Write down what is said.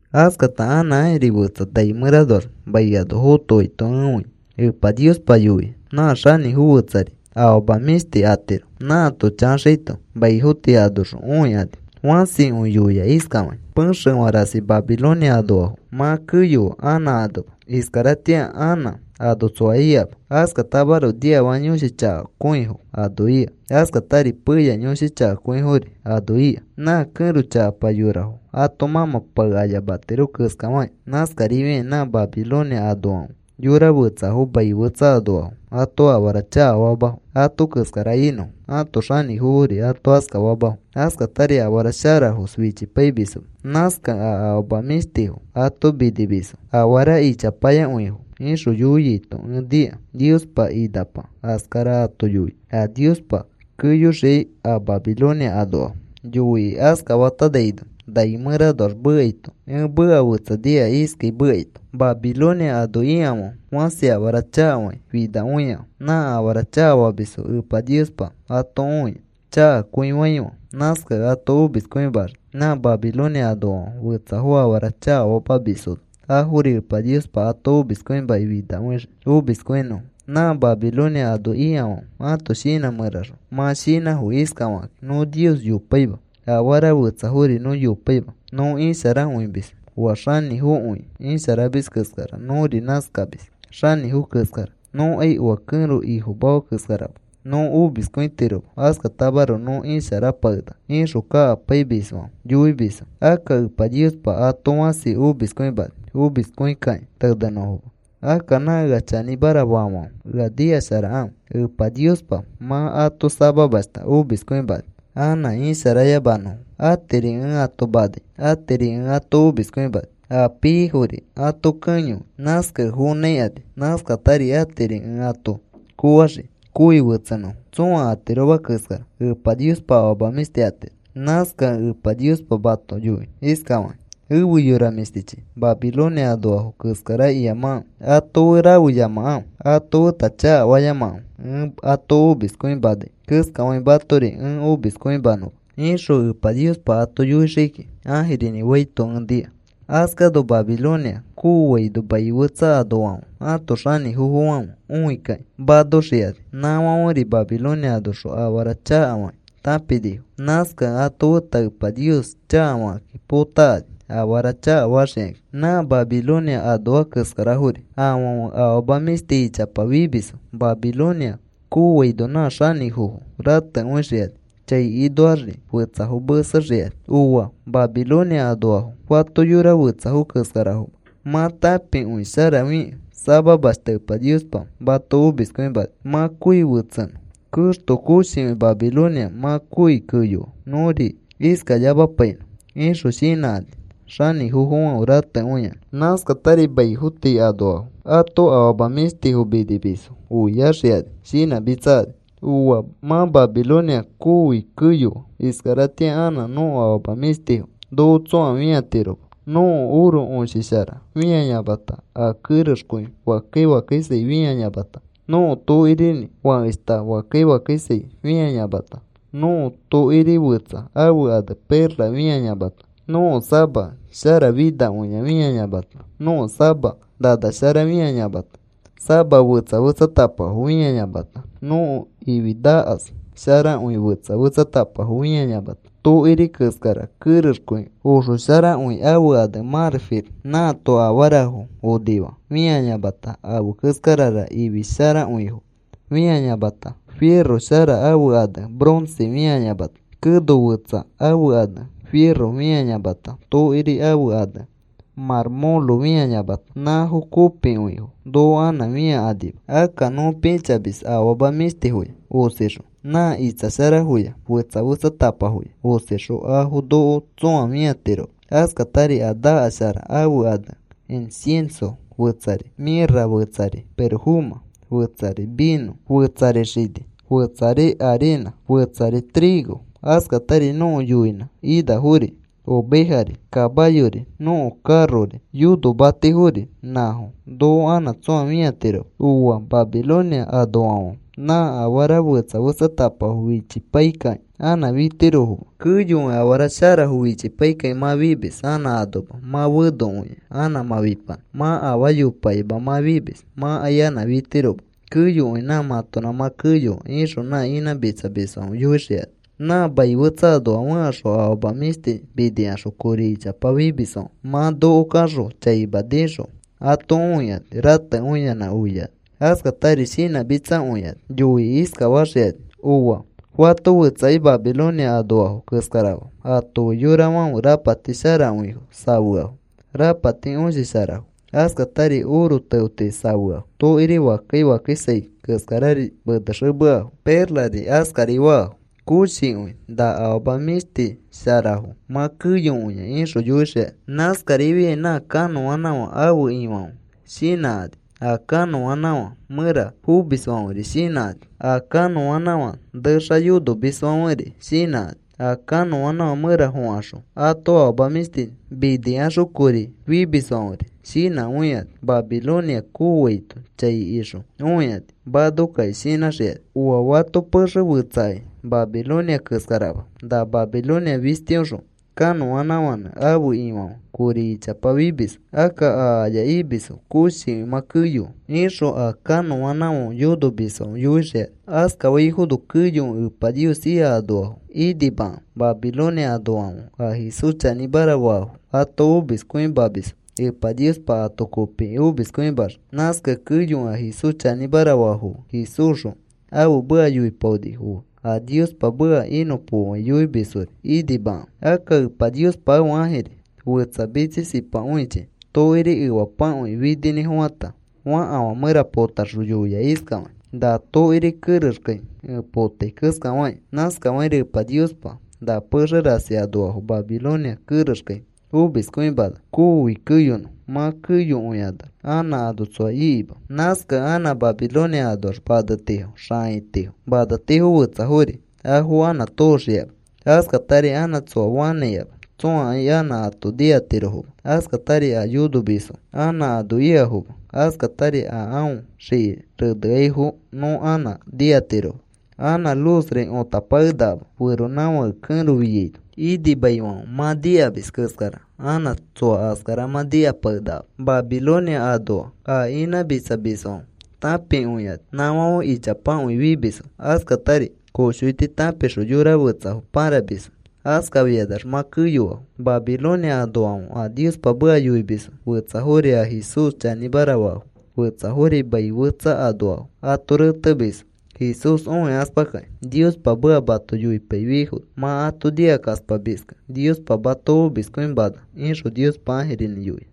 Askata anã ãjiri fetsa nai mẽranoax mai ano fotoaito ẽ õia. Epa Niospa yoia nã xanĩfo fẽtsari afama mĩshti atiro. Nãato chaxaito maifo tii anoxõ õikani. Fãsikõi yoia iskafakĩ: Pexefã rasi Babilonia anoafo mã keyoa, anã anoma. Iskaratĩa anã ano tsoa ikama, askatamaroko niafaka yõshi chakakõifo ano ika, askatari peya yõshi chakakõifori ano ika. Nã kẽro chakapa yorafo ato mãmã pae ayamatiro keskafakĩ, nãskarifiakĩ nã Babilonia anoafãfe yora fetsafo mai fetsa anoafo ato afara chakafamafo ato keskara inõfo. Ãto xanĩfofori ato askafamafo. Askatari afara sharafos fichipaimisfo. Nãskakẽ a afama mĩshtifo ato minimisfo, afara ichapayakõifo, ixõ yoiaito ẽ nika. Niospa inapa askara ato yoia a Niospa keyoxiai a Babilonia anoafo. Yoikĩ askafatanaino nai mẽranoax mekaito ẽ meka fetsa nika iskai mekaito: Babilonia ano ikafãfe fãsi afara chakafakĩ finakõiafo. Nã afara chakafamisfo Epa Niospa ato õia chakakõifaifãfe. Nãskakẽ ato omiskõimaxii. Nã Babilonia anoafãfe fetsafo afara chakafamamisfono afori. Epa Niospa ato omiskõimakĩ finakõixii omiskõinõfo. Nã Babilonia ano ikafãfe ãto shinã mẽraxõ mã shinãfo iskafakakĩ: “Nõ Nios yopaima. Afara fetsafori nõ yopaima. Nõ isharakõimis. Oa xanĩfokõi isharamis keskara nõri nãskamis, xanĩfo keskara. Nõkai oa kẽro ifomafa keskarama. Nõ omiskõitiroma. Askatamaroko nõ isharapakenaka,” ixõ kakapaimisfãfe yoimisfo. Akka Epa Niospa ato fãsi omiskõimani omiskõikakĩ tenẽnõfoma. Akka nã ea chanĩmara faafãfe, ea nikasharakãfe. Epa Niospa mã ato samamashta omiskõimani anã isharayamanõfo. Atiri ẽ ato namai, atiri ẽ ato omiskõimani, a piaifori ato kẽyoi. Nãskakẽ fonãikani. Nãskatari atiri ẽ ato koofaxii kooi fetsenõfo. Tsõa atiroma keskara Epa Niospa afama mĩshti atiro. Nãskakẽ Epa Niospa mato yoi iskafakĩ: “Efe yora mĩshtichi, Babilonia anoafo keskara iyamakãfe. Ato fe rafeyamakãfe. Ato feta chakafayamakãfe ẽ ato omiskõimanai keskafakĩ, matori ẽ omiskõimanõma,” ixõ Epa Niospa ato yoixii kiki, ãjirinĩ faito ẽ nika. Askano Babilonia kooaino mai fetsa anoafãfe ãto xanĩfofofãfe õikakĩ manoxikani. Nãfãferi Babilonia anoxõ afara chakafakĩ tãpinifo. Nãskakẽ ato feta Epa Nios chakafakakĩ potakani afara chakafaxikakĩ. Nã Babilonia anoa keskarafori afãfe afama mĩshti ichapa fimisfo. Babilonia kooaino nã xanĩfofo ratekõixikani chai inoaxri fetsafo mesexikani. ¡Ooa! Babilonia anoafo fato yora fetsafo keskarafoma. Mã tãpikõisharafikẽ samamashta Epa Niospa mato omiskõimani mã kooi fetsenõ. ¡Keexto! Koshikõi Babilonia mã kooi keyoa. Nõri iskayamapainõ, ixõ shinãkani xanĩfofofãfe ratekõiyanã. Nãskatari maifo tii anoafo ãto afama mĩshtifo minimisfo oiaxikani shinãmitsakani. “¡Ooa! Mã Babilonia kooi keyoa. Iskaratĩa anã nõko afama mĩshtifo noko tsõa fĩatiroma. Nõko oro õshishara fĩayamata, a kerexkõi fakkai fakkaisai fĩayamata, nõko tokirinĩ fakeshta fakkai fakkaisai fĩayamata, nõko tokiri fetsa ãfe ane perla fĩayamata, nõko sama sharafinakõia fĩayamata, nõko sama nana shara fĩayamata, sama fetsa fetsatapafo fĩayamata, nõko ifi nakas sharakõi fetsa fetsatapafo fĩayamata, tokiri keskara kerexkõi oxosharakõi ãfe ane mãrfil nãato afarafo onifaa fĩayamata, afe keskarara ifi sharakõifo fĩayamata, firo shara ãfe ane bronce fĩayamata, keno fetsa ãfe ane firo fĩayamata, tokiri ãfe ane mãrmõlo fĩayamata, nãfo kopikõifo noko anã fĩakanima. Akka nõ pĩchamis afama mĩshtifoya osixõ, nã itsa sharafoya fetsa fetsatapafoya osixõ, afo noko tsõa fĩatiroma. Askatari a nakas shara ãfe ane incienso, fetsari mĩrra, fetsari pirofomã, fetsari vinõ, fetsari xini, fetsari arinã, fetsari trigo, askatari nõko yoinã inafori ovejari, kamayori, nõko karori, yonomatifori, nãfo noko anã tsõa fĩatiroma. ¡Ooa! Babilonia anofãfe nã afara fetsa fetsatapafo fichipaikakĩ anã fitirofoma. Keyokõi afara sharafo fichipaikakĩ mã fimis anã anoma mã fenokõia anã mã fipanã. Mã afaa yopakima mã fimis. Mãkai anã fitiroma. Keyokõi nã mãtonã mã keyoa,” ixõ nã inãmitsamisfãfe yoixikani. Nã mai fetsa anoa fẽkaxõ afama mĩshti minikaxõ kori ichapa fimisfãfe mã noko kaxõ chaima nĩxõ ato õikani, ratekõiyanã, oiakani, askatari shinãmitsakõikani. Yoikĩ iskafaxikani: “¡Ooa! Fato fetsakai Babilonia anoafo keskarama. Ato fe yorafãfe rapati sharakõifo safeafo. Rapati õshi sharafo, askatari oro teoti safeafo, tokiri fakkai fakkaisai keskarari menexemeafo, perlari askari faafo. Koshikõi na afama mĩshtisharafo mã keyokõia,” ixõ yoixikani. Nãskarifiai nã kanõanãfã ãfe ifofãfe shinãkani, a kanõanãfã mẽra fomisfãferi shinãkani, a kanõanãfã nexa yonomisfãferi shinãkani, a kanõanãfã mẽra fokaxõ, ato afama mĩshti minikaxõ kori fimisfãferi shinãkõikani. Babilonia kooaito chai ixõ õikani manokakĩ shinãxikani. “¡Ooa! Fato pexe fetsakai Babilonia keskarama. Na Babilonia fistiõxõ kanõanãfãnẽ ãfe ifofãfe kori ichapa fimisfo. Akka a aya imisfo koshikõi mã keyoa,” ixõ a kanõanãfãõ yonomisfãfe yoixikani. Askaifono keyokõi Epa Nios ika anoafo inimakãfe. Babilonia anoafãfe a Jesús chanĩmara faafo ato omiskõimamisfo, Epa Niospa ato kopikĩ omiskõimaxii. Nãskakẽ keyokõi a Jesús chanĩmara faafo fe, Jesúsxõ ãfe meka yoipaonifo fe, a Niospa meka inõpokoai yoimisfori inimakãfe. Akka Epa Niospa ãfe ãjiri fetsa mitsisipakõichi tokiri efapakõi fininĩfofãta fakafã mẽra potaxõ yoia iskafakĩ: “Na tokiri kerexkai ẽ potai keskafakĩ, nãskafakĩri Epa Niospa na pexe rasi anoafo Babilonia kerexkai omiskõimana kooi keyonõ. Mã keyokõikanax anã ano tsoa ikima. Nãskakẽ anã Babilonia anoax manetifo, xãitifo, maneti fetsafori, afo anã tooxikama. Askatari anã tsoa fanãikama. Tsõakai anã ato nikatirofoma. Askatari a yonomisfo anã ano ikafoma. Askatari a aõ xiki reneaifo nõ anã nikatiroma. Anã luzri õtapakenakama. Feronãfãke kẽro fiaino inimaifãfe mã nikamis keskara anã tsoa askara mã nikapakenakama. Babilonia anoa a inãmitsamisfãfe tãpikõikani. Nãfãfe ichapakõi fimisfo. Askatari koshoiti tãpixõ yora fetsafo pãramisfo. Askafikanax mã keyoafo. “Babilonia anoafãfe a Niospa meka yoimisfo, fetsafori a Jesús chanĩmara faafo, fetsafori mai fetsa anoafo ato retemisfo Jesús õikaspakakĩ. Niospa meka mato yoipaifiaifono mã ato nikakaspamiskẽ, Niospa mato omiskõimana,” ixõ Niospa ãjirinĩ yoia.